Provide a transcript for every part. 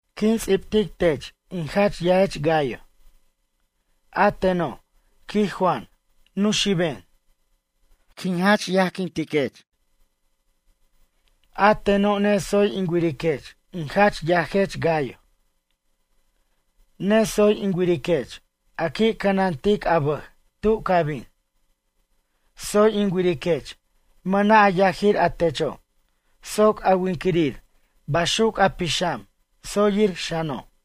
Quin ts'ibtic tech in jach yajech Gayo. A teno', quij Juan, nuxiben. Quin jach yajquintiquech. A teno' netsoy in wiriquech in jach yajech Gayo. Netsoy in wiriquech a qui' cʌnantic a bʌj tu ca bin. Tsoy in wiriquech mʌna' a yajir a techo' soc a winquirir baxuc a pixam, tsoyir xano'.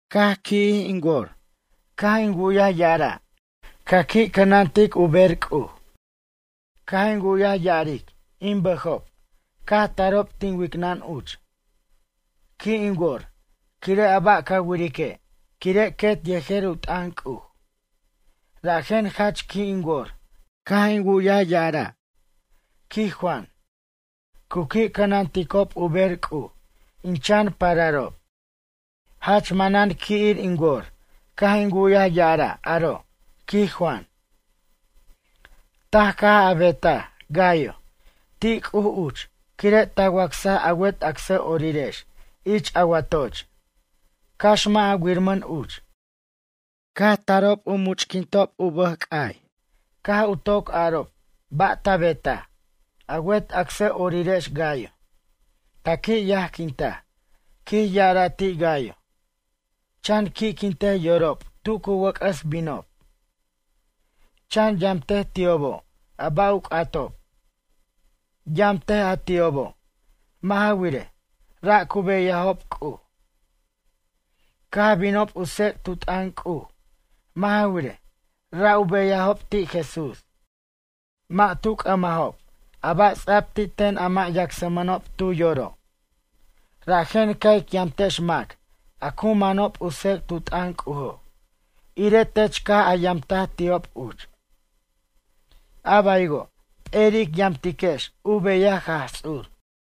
Caj qui'jij in wor caj in wu'yaj ya'ara', ca qui' cʌnantic u bej C'uj. Caj in wu'yaj ya'aric in bʌjob caj tarob tin wicnʌn uch. Qui' in wor quire' a ba' ca wirique' quire' quet yejer u t'ʌn C'uj. Rajen jach qui' in wor caj in wu'yaj ya'araj, quij Juan, cu qui' cʌnanticob u ber C'uj in chan pararob. Jach manan qui'ir in wor caj in wu'yaj ya'ara' aro', quij Juan. Taj caj a betaj, Gayo, ti' C'uj uch quire' ta wacsaj a wet acsʌ'orirex ich a watoch, cax mʌ' a wirmʌn uch. Caj tarob u much'quintob u bʌj c'ay caj u toc arob ba' ta betaj, a wet acsʌ'orirex Gayo. Ta qui' yajquintaj, quij ya'ara ti' Gayo. Chan qui'quintej yorob tu cu wʌc'ʌs binob. Chan yamtej ti'obo' a ba' u c'atob. Yamtej a ti'obo', mʌ' ja wirej, ra' cu beyajob C'uj. Caj binob u tsec' tu t'ʌn C'uj, mʌ' ja wirej, ra' u beyajob ti' Jesús. Mʌ' tu c'ʌmanob a ba' ts'a'b ti' ten a mʌ' yacsmʌnob tu yoro'. Rajen ca' ic yamtex mac a cu manob u tsec't u t'ʌn C'ujo' irej tech caj a yamtaj ti'ob uch. A baywo' p'eri' ic yamtiquex u beyaj Jaj Ts'ur.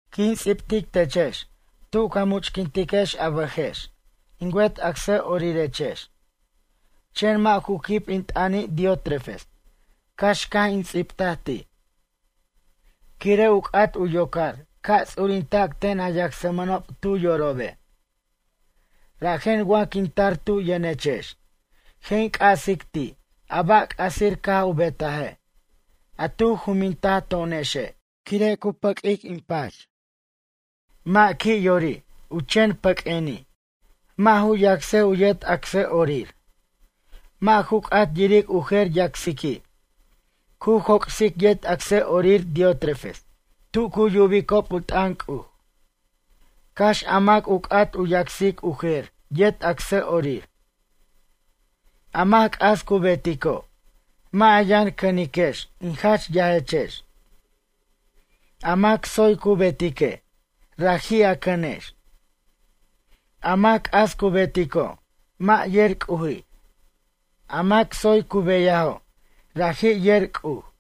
Quin ts'ibtic techex tu ca much'quintiquex a bʌjex, in wet acsʌ'orirechex, chen mʌ' ju quib in t'ʌni' Diótrefes cax caj in ts'ibtaj ti'. Quire' u c'at u yocar ca' ts'urintac ten a yacsmʌnob tu yorobe'. Rajen wa quin tar tu yʌnechex, je' in c'asic ti' a ba' c'asir caj u betaje', a tu juminta to'onexe' quire' u pʌq'uic in pach. Mʌ' qui' yori' u chen pʌq'ueni', mʌ' ju yacsej u yet acsʌ'orir. Mʌ' ju c'at yiric u jer yacsiqui'. Cu joc'sic yet acsʌ'orir Diótrefes tu cu yubicob u t'ʌn C'uj, cax a mac u c'at u yacsic u jer yet acsʌ'orir. A mac c'as cu betico', mʌ' a yʌn cʌniquex in jach yajechex. A mac tsoy cu betique', raji' a cʌnex. A mac c'as cu betico', mʌ' yer C'uji'. A mac tsoy cu beyajo', raji' yer C'uj.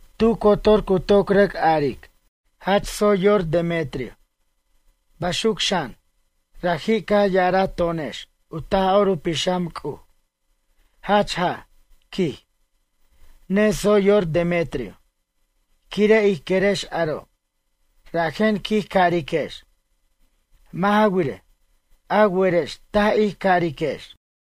Tu cotor cu toc rʌc aric: “Jach tsoy yor Demetrio.” Baxuc xan, raji' caj ya'araj to'onex u Taj'or u Pixam C'uj: “Jach jaj, quij, netsoy yor Demetrio.” Quire' ij querex aro', rajen quij cariquex. Mʌ' ja wirej, a werex taj ij cariquex.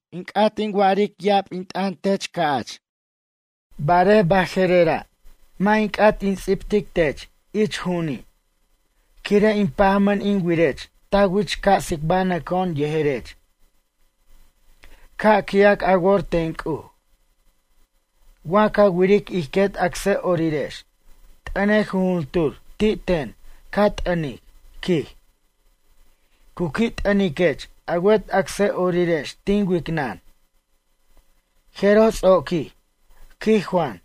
In c'at in wa'aric ya'ab in t'ʌn tech, Gayo, ca'ch barej baje'rera' mʌ' in c'at in ts'ibtic tech ich ju'uni'. Quire' in pajmʌn in wirech ta wich ca' tsicbanʌco'on yejerech. Ca' qui'ac a wor ten C'uj. Wa ca wiric ij quet acsʌ'orirex, t'ʌnej jujuntur ti' ten ca t'ʌnic, quij. Cu qui' t'ʌniquech a wet acsʌ'orirex tin wicnʌn. Jeroj ts'oquij, quij Juan.